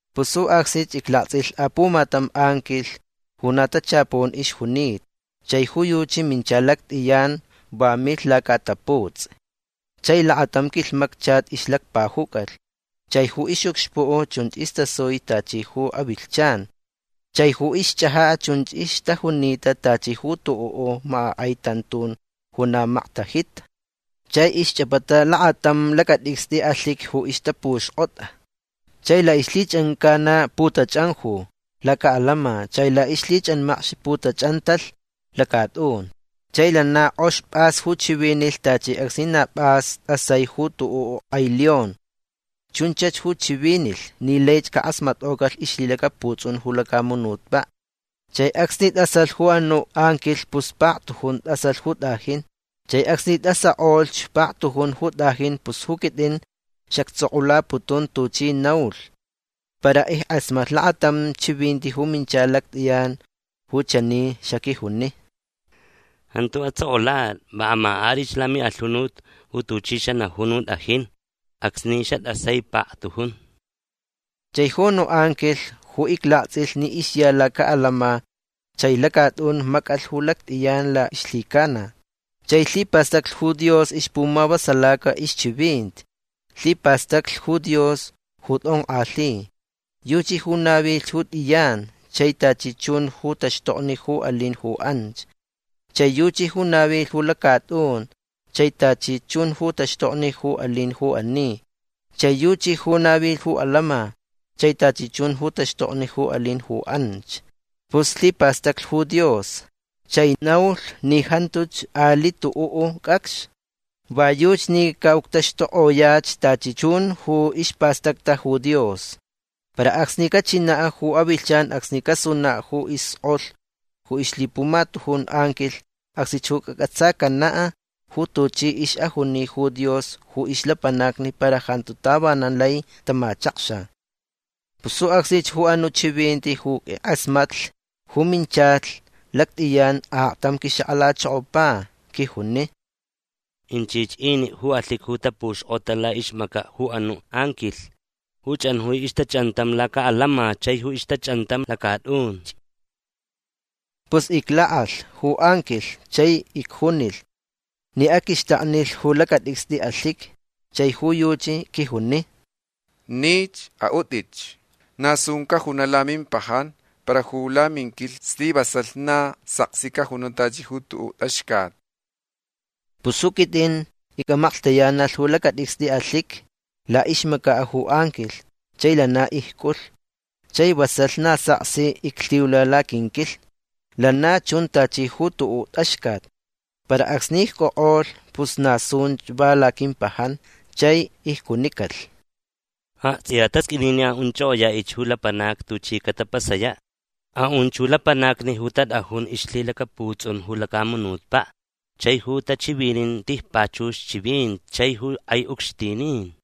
Pus ju acsnich iclaktsʼilh apumatam anquilh ju na tachapun ixjunita. Chai ju yuchi mincha lactʼiyan. Va milh lacaʼataputsʼi. Chai lakatam quilhmacchat ixlacpajucalh. Chai ju ixʼucxpuʼ chunch istasui tachi ju avilhchan. Chai ju ixchʼajaʼ chunch ixtajunita tachi ju tuʼuʼ makʼakʼai tantun ju na maktajita. Chai ixchʼapata lakatam lacatʼicstʼi alhiqui ju ixtapuxkʼota. Chai laʼixlhichʼancana putachʼanju lacaʼalama. Chai laʼixlhichʼanmacx putachʼantalh lacatʼun. Chai lana kʼox pʼas ju chivinilh tachi acsni na pʼas tʼasai ju tuʼuʼ kʼai león. Chunchach ju chivinilh ni laich cakʼasmatkʼocalh ixlhilacaputsʼun ju lacamunutpaʼ. Chai acsni tʼasalh ju anuʼ anquilh pus paktujun tʼasalh ju tʼajin. Chai acsni istʼasakʼolhch paktujun ju tʼajin pus ju quitʼin xactsʼokʼulaputun tuchi naulh. Para ickʼasmatlh lakatam chivinti ju mincha lactʼiyan ju chani xaquijuni: ―Jantu atsʼokʼulatʼi. Va amakʼatʼich lamiʼalhunut ju tuchi xanajun ju tʼajin acsni xatʼasai paktujun. Chai ju anuʼ anquilh ju iclaktsʼilh ni ixya lacaʼalama chai lacatʼun macʼalh ju lactʼiyan laʼixlhicana. Chai lhipastacli ju Dios ixpumavasalaca ixchivinti. Lhipastaclh ju Dios ju tʼonkʼalhi. Yuchi ju navilh ju tʼiyan chai tachi chun ju taxtokni ju alin ju anch. Chai yuchi ju navilh ju lacatʼun chai tachi chun ju taxtokni ju alin ju ani. Chai yuchi ju navilh ju lacatʼun chai tachi chun ju taxtokni ju alin ju anch. Pus lhipastacli ju Dios chai naulh ni jantuch aliʼ tuʼuʼ cʼacx. Va yuchi ni caʼuctaxtukʼoyach tachi chun ju ispastacta ju Dios. Para acsni cachinaʼ ju avilhchan acsni casunaʼ ju iskʼolh ju ixlhipumatujun anquilh acsnich ju cacʼatsacanaʼ ju tuchi ixʼajuni ju Dios ju ixlapanacni para jantu tavanan lai tamachakxa. Pus ju acsnich ju anuʼ chivinti ju ickʼasmatlh ju minchalh lactʼiyan aktam quixakʼalachokopa. Quijuni: ―Inchich iniʼ ju alhiqui ju tapuxkʼota laʼixmacaʼ ju anuʼ anquilh ju chʼanjui ixtachʼantam lacaʼalama chai ju ixtachʼantam lacatʼunch. Pus iclakʼalh ju anquilh chai icjunilh ni aquixtaknilh ju lacatʼicstʼi alhiqui. Chai ju yuchi quijuni: ―Nich. Aʼutʼich. Na sun cajunaʼ lamimpajan para ju laminquilhni slivasalh na saksi cajunaʼ tachi ju tuʼuʼ tʼaxcat. Pus ju quitʼin icʼamaklhtayanalh ju lacatʼicstʼi alhiqui laʼixmacaʼ ju anquilh chai lana icʼulh. Chai vasalh na saksi iclhiula laquinquilhni. Lana chun tachi ju tuʼuʼ tʼaxcat. Para acsni icʼokʼolh pus na sunch va laquimpajan. Chai icjunicalh: ―Aktsʼiya tasqʼuini ni aʼunchʼokʼoyaʼich ju lapanacni tuchi catapasayaʼ. Aʼunch ju lapanacni ju tatʼajun ixlhilacaputsʼun ju lacamunutpaʼ chai ju tachivinin tijpachux chivinti chai ju kʼai ucxtinin.